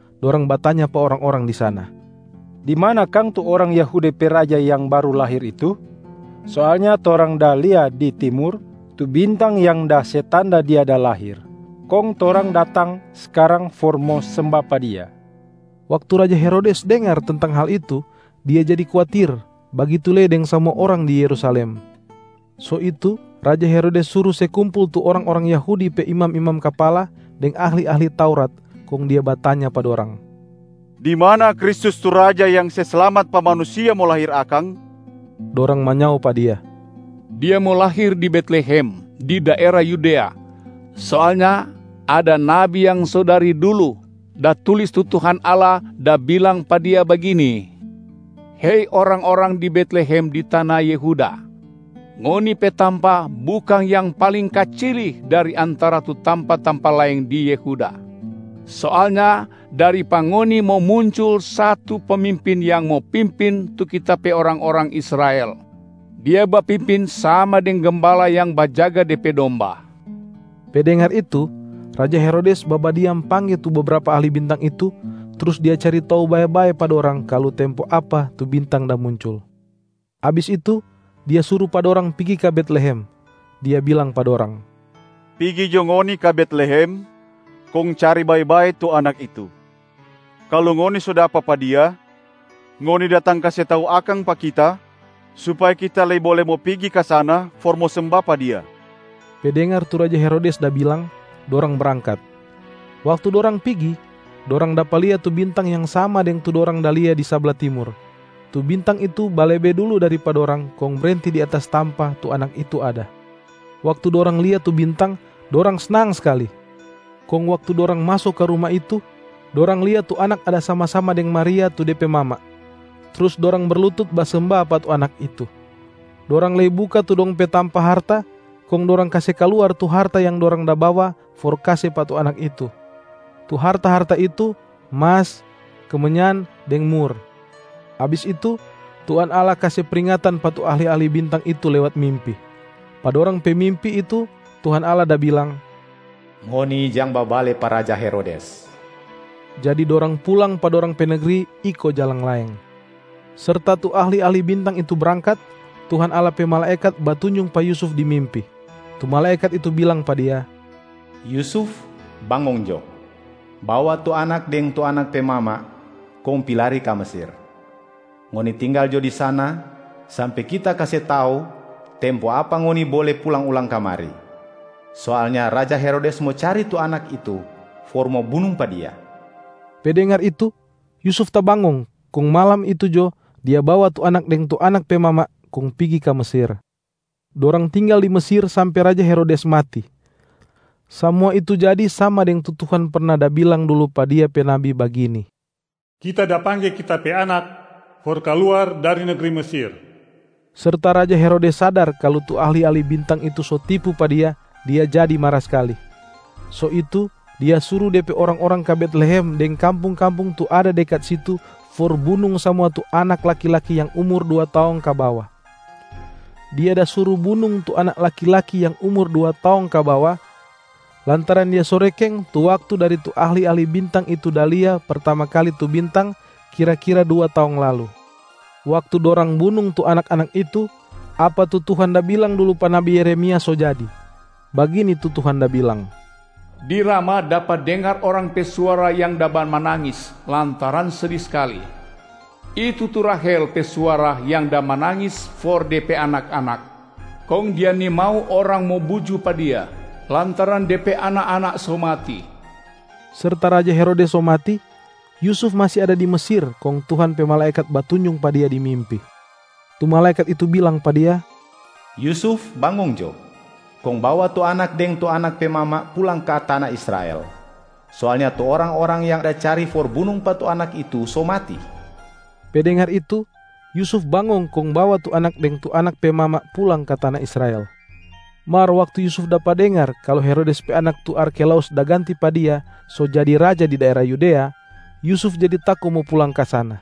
Dorang batanya pa orang-orang di sana, “Di mana kang tu orang Yahudi pe raja yang baru lahir itu? Soalnya torang da lia di Timur tu bintang yang da se tanda Dia da lahir, kong torang datang skarang for mo semba pa Dia.” Waktu raja Herodes dengar tentang hal itu, dia jadi kuatir, bagitu lei deng samua orang di Yerusalem. So itu raja Herodes suru se kumpul tu orang-orang Yahudi pe imam-imam kapala deng ahli-ahli Taurat, kong dia batanya pa dorang, “Di mana Kristus tu Raja yang se slamat pa manusia mo lahir akang?” Dorang manyao pa dia, “Dia mo lahir di Betlehem, di daera Yudea. Soalnya ada nabi yang so dari dulu da tulis tu Tuhan Allah da bilang pa dia bagini, ‘Hei orang-orang di Betlehem di tana Yehuda. Ngoni pe tampa bukang yang paling kacili dari antara tu tampa-tampa laeng di Yehuda. Soalnya dari pa ngoni mo muncul satu pemimpin yang mo pimpin tu Kita pe orang-orang Israel, Dia bapimpin sama deng gembala yang bajaga de pe domba.’” Pe dengar itu, raja Herodes babadiam pangge tu bebrapa ahli bintang itu, trus dia cari tau bae-bae pa dorang kalu tempo apa tu bintang da muncul. Abis itu, dia suru pa dorang pigi ka Betlehem. Dia bilang pa dorang, “Pigi jo ngoni ka Betlehem, kong cari bae-bae tu Anak itu. Kalu ngoni so dapa pa Dia, ngoni datang kase tau akang pa kita supaya kita lei bole mo pigi ka sana for mo semba pa Dia.” Pe dengar tu raja Herodes da bilang, dorang brangkat. Waktu dorang pigi, dorang dapa lia tu bintang yang sama deng tu dorang da lia di sabla Timur. Tu bintang itu balebe dulu dari pa dorang kong brenti di atas tampa tu Anak itu ada. Waktu dorang lia tu bintang, dorang snang skali. Kong waktu dorang maso ka ruma itu, dorang lia tu Anak ada sama-sama deng Maria tu de pe mama. Trus dorang berlutut basemba pa tu Anak itu. Dorang lei buka tu dong pe tampa harta, kong dorang kase kaluar tu harta yang dorang da bawa for kase pa tu Anak itu. Tu harta-harta itu: mas, kemenyan deng mur.a Abis itu, Tuhan Allah kase pringatan pa tu ahli-ahli bintang itu lewat mimpi. Pa dorang pe mimpi itu Tuhan Allah da bilang, “Ngoni jang babale pa raja Herodes.” Jadi dorang pulang pa dorang pe negri iko jalang laeng. Serta tu ahli-ahli bintang itu brangkat, Tuhan Allah pe malaekat batunjung pa Yusuf di mimpi. Tu malaekat itu bilang pa dia, “Yusuf, bangong jo! Bawa tu Anak deng tu Anak pe mama kong pi lari ka Mesir. Ngoni tinggal jo di sana sampe kita kase tau tempo apa ngoni bole pulang ulang kamari. Soalnya raja Herodes mo cari tu Anak itu for mo bunung pa Dia.” Pe dengar itu, Yusuf tabangong, kong malam itu jo, dia bawa tu Anak deng tu Anak pe mama kong pigi ka Mesir. Dorang tinggal di Mesir sampe raja Herodes mati. Samua itu jadi sama deng tu Tuhan perna da bilang dulu pa Dia pe nabi bagini, “Kita da pangge Kita pe Anak for kaluar dari negri Mesir.” Serta raja Herodes sadar kalu tu ahli-ahli bintang itu so tipu pa dia, dia jadi mara skali. So itu dia suru de pe orang-orang ka Betlehem deng kampung-kampung tu ada dekat situ for bunung samua tu anak laki-laki yang umur dua taong ka bawa. Dia da suru bunung tu anak laki-laki yang umur dua taong ka bawa lantaran dia so rekeng tu waktu dari tu ahli-ahli bintang itu da lia pertama kali tu bintang kira-kira dua taong lalu. Waktu dorang bunung tu anak-anak itu, apa tu Tuhan da bilang dulu pa nabi Yeremia so jadi. Bagini tu Tuhan da bilang, “Di Rama, dapa dengar orang pe suara yang da bamanangis lantaran sedi skali. Itu tu Rahelb pe suara yang da manangis for de pe anak-anak. Kong dia nimau orang mo buju pa dia, lantaran de pe anak-anak so mati.” Serta raja Herodes so mati, Yusuf masi ada di Mesir kong Tuhan pe malaekat batunjung pa dia di mimpi. Tu malaekat itu bilang pa dia, “Yusuf bangong jo, kong bawa tu Anak deng tu Anak pe mama pulang ka tana Israel. Soalnya tu orang-orang yang da cari for bunung pa tu Anak itu so mati.” Pe dengar itu, Yusuf bangong kong bawa tu Anak deng tu Anak pe mama pulang ka tana Israel. Mar waktu Yusuf dapa dengar kalu Herodes pe anak tu Arkhelaus da ganti pa dia so jadi raja di daera Yudea, Yusuf jadi tako mo pulang ka sana.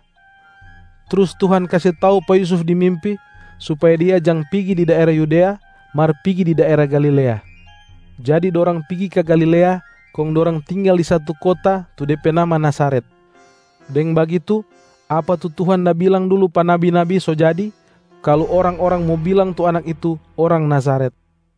Trus Tuhan kase tau pa Yusuf di mimpi, supaya dia jang pigi di daera Yudea mar pigi di daera Galilea. Jadi dorang pigi ka Galilea, kong dorang tinggal di satu kota tu de pe nama Nazaret. Deng bagitu, apa tu Tuhan da bilang dulu pa nabi-nabi so jadi, kalu orang-orang mo bilang tu Anak itu, ‘orang Nazaret’.